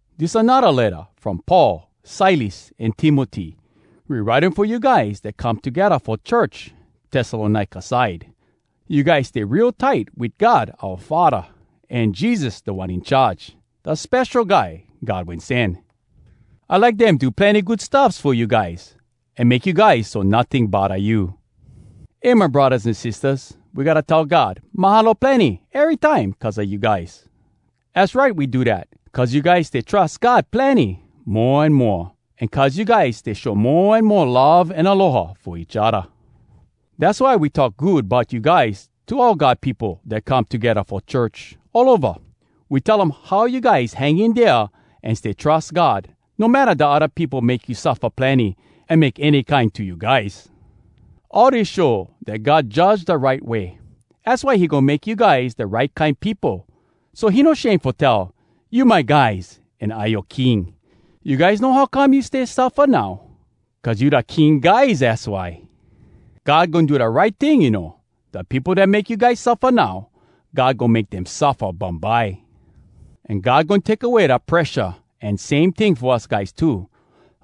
Dis anodda letta from Paul, Silas, an Timoty. We write um fo you guys dat come togedda fo church Tessalonika side. You guys stay real tight wit God oua Faddah an Jesus Da One In Charge, da Spesho Guy God Wen Sen. I like dem do plenny good stuffs fo you guys, an make you guys so notting bodda you! Eh my braddahs an sistahs, we gotta tell God “Mahalo plenny!” erytime cuz a you guys. Az right we do dat, cuz you guys stay trus God plenny mo an moa, an cuz you guys stay show mo an mo love an aloha fo each odda. Dass why we talk good bout you guys to all God peopo dat come togedda fo church, all ova. We tell um how you guys hang in dea an stay trus God, no matta da odda peopo make you suffa plenny an make any kine to you guys. All dis show dat God judge da right way. Az why he goin make you guys da right kine peopo, so he no shame fo tell, “You my guys, an I yoa King.” You guys know how come you stay suffa now? Cuz you da King guys, az why. God goin do da right ting, you know. Da peopo dat make you guys suffa now, God goin make dem suffa bumbye. An God goin take away da presha, an same ting fo us guys too.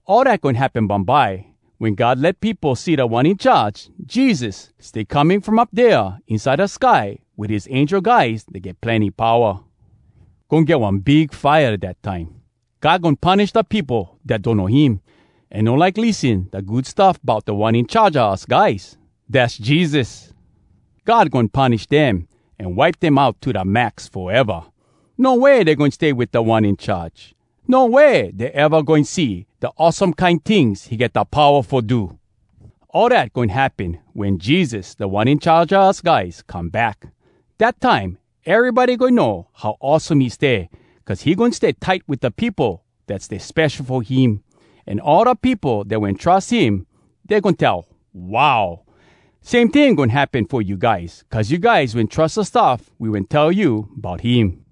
All dat goin happen bumbye, wen God let peopo see Da One In Charge, Jesus, stay coming from up dea inside da sky wit his angel guys dat get plenny powa. Goin get one big fire dat time. God goin punish da peopo dat donno him, an no like lissen da Good Stuff Bout Da One In Charge a us guys, dass Jesus. God goin punish dem, an wipe dem out to da max foeva. No way dey goin stay wit Da One In Charge. No way dey eva goin see da awesome kine tings he get da powa fo do. All dat goin happen wen Jesus, Da One In Charge a us guys, come back. Dat time, erybody goin know how awesome he stay, cuz he goin stay tight wit da peopo dat stay spesho fo him. An all da peopo dat wen trus him, dey goin tell, “Wow!” Same ting goin happen fo you guys, cuz you guys wen trus da stuff we wen tell you bout him.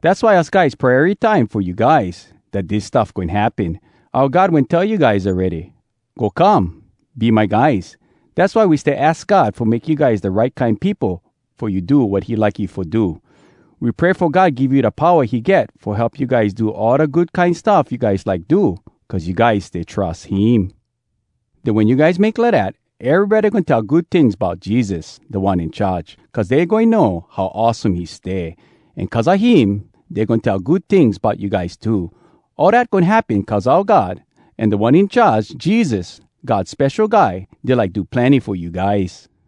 Dass why us guys pray erytime fo you guys dat dis stuff goin happen. Oua God wen tell you guys awready, “Go come! Be my guys!” Dass why we stay aks God fo make you guys da right kine peopo fo you do wat he like you fo do. We pray fo God give you da powa he get fo help you guys do all da good kine stuff you like do cuz you guys stay trus him. Den, wen you guys make lidat, erybody goin tell good tings bout Jesus, Da One In Charge, cuz dey goin know how awesome he stay. An cuz a him, dey goin tell good tings bout you guys too. All dat goin happen cuz oua God, an Da One In Charge, Jesus, God Spesho Guy, dey like do plenny fo you guys.